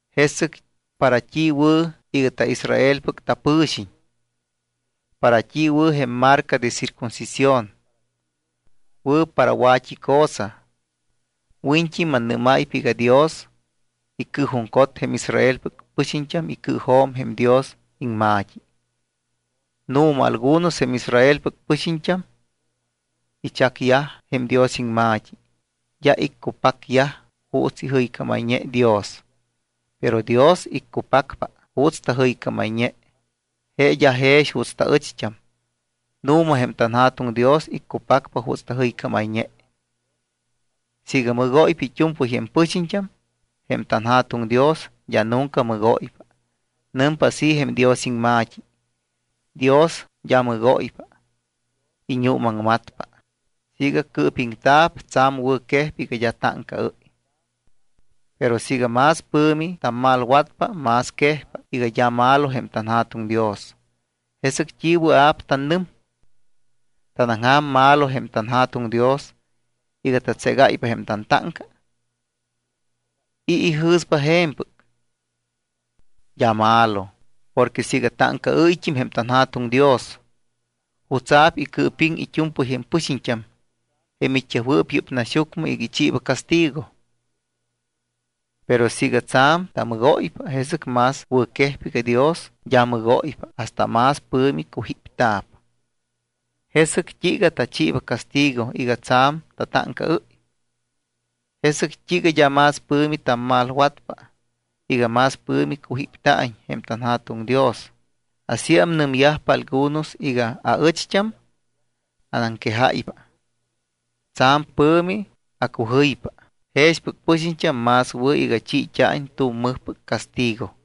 ¿Jesɨc para t́i wɨ̱ iga taIsraelpɨc tapɨxiñt́am? ¿Para t́i wɨ̱ jém marca de circuncisión? Wɨ̱ para wa̱t́i cosa. Wiñt́i mannɨ́máypa iga Dios icɨɨjuŋcot jém Israelpɨc pɨxiñt́am icɨɨjo̱m jém Dios iŋma̱t́i. Nu̱ma, algunos jém Israelpɨc pɨxiñt́am ichacyaj jém Dios iŋma̱t́i, d́a iccupacyaj juuts ijɨycámayñeyaj Dios. Pero Dios iccupacpa juuts tajɨycámayñe, je d́a jex juuts taɨcht́am. Nu̱ma, jém tanJa̱tuŋ Dios iccupacpa juuts tajɨycámayñe. Siiga mɨgóypa it́u̱mpɨy jém pɨxiñt́am, jém tanJa̱tuŋ Dios d́a nunca mɨgóypa. Nɨmpa así jém Dios iŋma̱t́i: Dios d́a mɨgóypa, iñuumaŋmatpa. Siiga cɨɨpiŋta̱p, tsa̱m wɨ̱quejpa iga d́a táŋcaɨ́y. Pero siiga más pɨ̱mi tammalwatpa, más quejpa iga d́a malo jém tanJa̱tuŋ Dios, ¿jesɨc t́i wɨa̱p tannɨm? ¿Tanaŋja̱m malo jém tanJa̱tuŋ Dios iga tatségáypa jém tantáŋca? ¿I̱ ijɨ̱spa je̱mpɨc? ¡D́a malo! Porque siiga táŋcaɨ́yt́im jém tanJa̱tuŋ Dios, ¿jutsa̱p icɨɨpiŋ it́u̱mpɨy jém pɨxiñt́am jém it́yajwɨɨp yɨ́p naxyucmɨ iga ichiiba castigo? Pero siiga tsa̱m tamɨgóypa, jesɨc más wɨ̱ quejpa iga Dios d́a mɨgóypa hasta más pɨ̱mi cujípta̱p. ¿Jesɨc t́iiga tachiiba castigo iga tsa̱m tatáŋcaɨ́y? ¿Jesɨc t́iiga d́a más pɨ̱mi tammalwatpa iga más pɨ̱mi cujípta̱iñ jém tanJa̱tuŋ Dios? Asíam nɨmyajpa algunos iga aɨcht́am anaŋquejáypa. Tsa̱m pɨ̱mi acujɨypa. Jexpɨc pɨxiñt́am más wɨ̱ iga chiit́a̱iñ tu̱m mɨjpɨc castigo.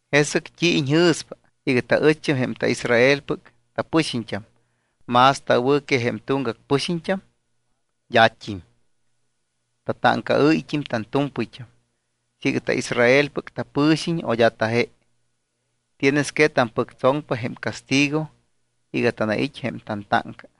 ¿Jesɨc t́i iñjɨ̱spa iga taɨcht́am jém taIsraelpɨc tapɨxiñt́am más tawɨ̱tam que jém tuŋgac pɨxiñt́am? D́at́im. Tatáŋcaɨ́yt́im tantu̱mpɨyt́am siiga taIsraelpɨc tapɨxiñt́am o d́a taje. Tienes que tampɨctsoŋpa jém castigo iga tanait́ jém tantáŋca.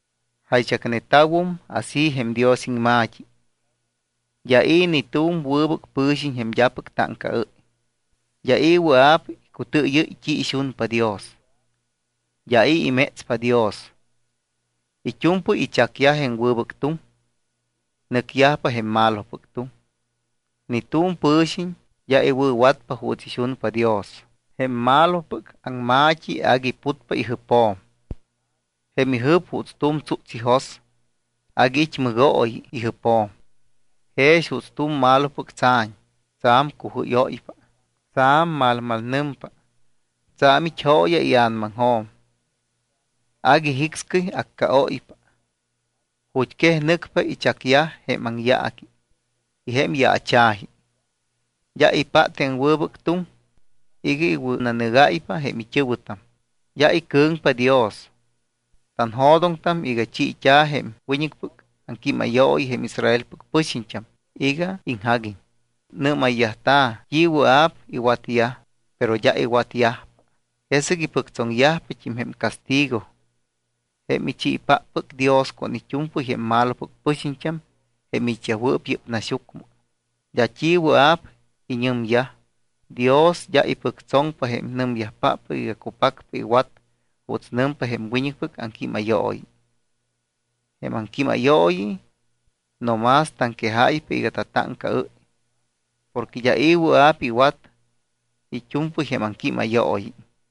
Jaychacneta̱wum así jém Dios iŋma̱t́i: D́a i̱ ni tu̱m wɨbɨc pɨ̱xiñ jém d́apɨc táŋcaɨ́y. D́a i̱ wɨa̱p icutɨɨyɨ́y t́i ixunpa Dios. D́a i̱ imétspa Dios. It́u̱mpɨy ichacyaj jém wɨbɨc tuŋ. Nɨcyajpa jém malopɨc tuŋ. Ni tu̱m pɨ̱xiñ d́a iwɨ̱watpa juuts ixunpa Dios. Jém malopɨc aŋma̱t́i agui putpa ijɨpjo̱m. Jém ijɨp juuts tu̱m tsúts ijos. Agui it́ mɨgooyi ijɨpjo̱m. Jex juuts tu̱m malopɨc tsa̱ñ, tsa̱m cujɨ́yóypa. Tsa̱m malmalnɨmpa. Tsa̱m it́ jooya ia̱namaŋjo̱m. Agui jicscɨy accaóypa. Ju̱t́quej nɨcpa ichacyaj jém aŋyaaqui y jém yaacha̱ji. D́a ipát jém wɨbɨc tuŋ iga iwɨ̱nanɨgáypa jém it́ɨ̱wɨtam. D́a icɨ̱ŋpa Dios. Tanjo̱doŋtam iga chiit́a̱ jém wiñɨcpɨc aŋquímayooyi jém Israelpɨc pɨxiñt́am iga iŋjaguiñ. Nɨ́mayyajta̱ t́i wɨa̱p iwatyaj, pero d́a iwatyajpa. Jesɨc ipɨctsoŋyajpat́im jém castigo jém ichiipáppɨc Dios con it́u̱mpɨy jém malopɨc pɨxiñt́am jém it́yajwɨɨp yɨ́p naxyucmɨ. D́a t́i wɨa̱p iñɨmyaj. Dios d́a ipɨctsoŋpa jém nɨmyajpáppɨc iga cupacpa iwat juuts nɨmpa jém wiñɨcpɨc aŋquímayooyi. Jém aŋquímayooyi no más taŋquejáypa iga tatáŋcaɨ́y porque d́a i̱ wɨa̱p iwat it́u̱mpɨy jém aŋquímayooyi.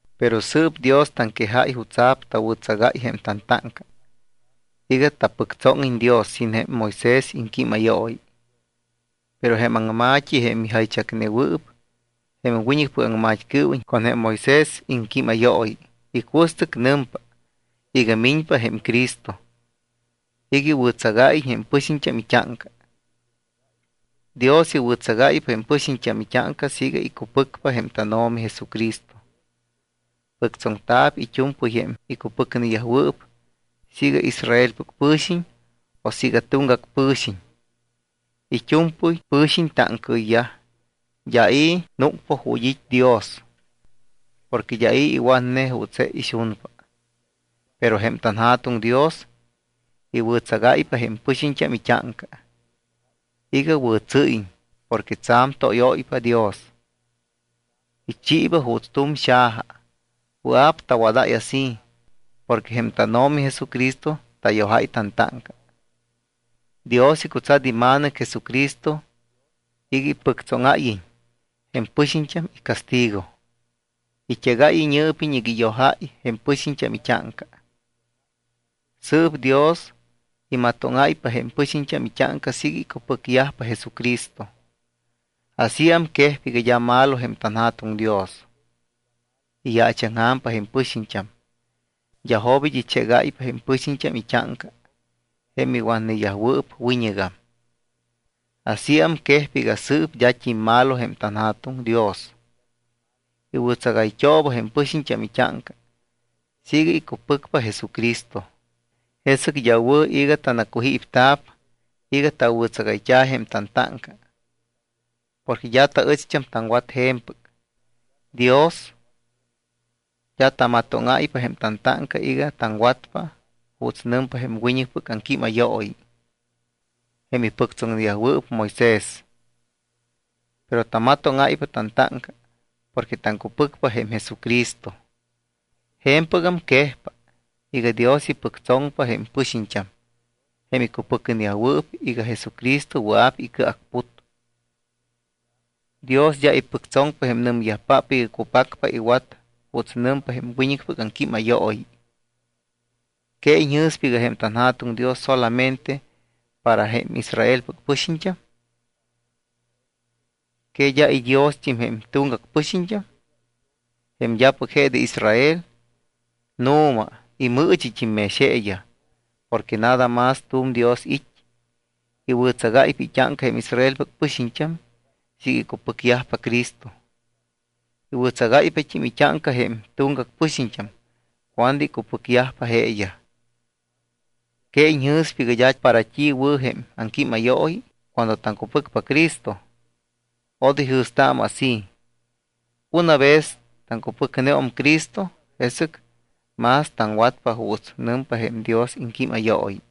Pero sɨɨp Dios taŋquejáy jutsa̱p tawɨ̱tsagáy jém tantáŋca iga tapɨctsóŋiñ Dios sin jém Moisés iŋquímayooyi. Pero jém aŋma̱t́i, jém ijaychacnewɨɨp jém wiñɨcpɨc aŋmat́cɨɨwiñ con jém Moisés iŋquímayooyi, icuɨstɨc nɨmpa iga miñpa jém Cristo iga iwɨ̱tsagáyiñ jém pɨxiñt́am it́áŋca. Dios iwɨ̱tsagáypa jém pɨxiñt́am it́áŋca siiga icupɨcpa jém tánO̱mi Jesucristo. Pɨctsoŋta̱p it́u̱mpɨy jém icupɨcneyajwɨɨp siiga Israelpɨc pɨ̱xiñ o siiga tuŋgac pɨ̱xiñ. It́u̱mpɨy pɨ̱xiñ táŋcaɨyyaj. D́a i̱ núcpa ju̱t́ it́ Dios porque d́a i̱ iwatne juuts je ixunpa. Pero jém tanJa̱tuŋ Dios iwɨ̱tsagáypa jém pɨxiñt́am it́áŋca iga wɨ̱tsɨ́yiñ porque tsa̱m tóyóypa Dios. Ichiiba juuts tu̱m xaja. Wɨa̱p tawadáy así porque jém tánO̱mi Jesucristo tayojáy tantáŋca. Dios icutsat iMa̱nɨc Jesucristo iga ipɨctsóŋáyiñ jém pɨxiñt́am icastigo. It́egáy iñɨɨpiñ iga iyojáy jém pɨxiñt́am it́áŋca. Sɨɨp Dios imatóŋáypa jém pɨxiñt́am it́áŋca siiga icupɨcyajpa Jesucristo. Asíam quejpa iga d́a malo jém tanJa̱tuŋ Dios. Iyaachaŋja̱mpa jém pɨxiñt́am. D́a jobit́ ichégáypa jém pɨxiñt́am it́áŋca jém iwatneyajwɨɨp wiñɨgam. Asíam quejpa iga sɨɨp d́at́im malo jém tanJa̱tuŋ Dios, iwɨ̱tsagayt́ooba jém pɨxiñt́am it́áŋca siiga icupɨcpa Jesucristo. Jesɨc d́a wɨ̱ iga tanacujípta̱p iga tawɨ̱tsagayt́a̱ jém tantáŋca porque d́a taɨcht́am taŋwat je̱mpɨc. Dios d́a tamatóŋáypa jém tantáŋca iga taŋwatpa juuts nɨmpa jém wiñɨcpɨc aŋquímayooyi, jém ipɨctsoŋnewɨɨp Moisés. Pero tamatóŋáypa tantáŋca porque taŋcupɨcpa jém Jesucristo. Je̱mpɨgam quejpa iga Dios ipɨctsoŋpa jém pɨxiñt́am jém icupɨcneyajwɨɨp iga Jesucristo wɨa̱p tacɨacput. Dios d́a ipɨctsoŋpa jém nɨmyajpáppɨc iga cupacpa iwat juuts nɨmpa jém wiñɨcpɨc aŋquímayooyi. ¿Que iñjɨ̱spa iga jém tanJa̱tuŋ Dios solamente para jém Israelpɨc pɨxiñt́am? ¿Que d́a iDiost́im jém tuŋgac pɨxiñt́am, jém d́apɨc je de Israel? Nu̱ma, imɨɨchit́im mex jeeyaj. Porque nada más tu̱m Dios it́. Iwɨ̱tsagáypa it́áŋca jém Israelpɨc pɨxiñt́am siiga icupɨcyajpa Cristo. Iwɨ̱tsagáypat́im it́áŋca jém tuŋgac pɨxiñt́am cuando icupɨcyajpa jeeyaj. ¿Que iñjɨ̱spa iga d́a para t́i wɨ̱ jém aŋquímayooyi cuando taŋcupɨcpa Cristo? Odoy jɨ̱staamɨ así. Una vez taŋcupɨcneum Cristo, jesɨc más taŋwatpa juuts nɨmpa jém Dios iŋquímayooyi.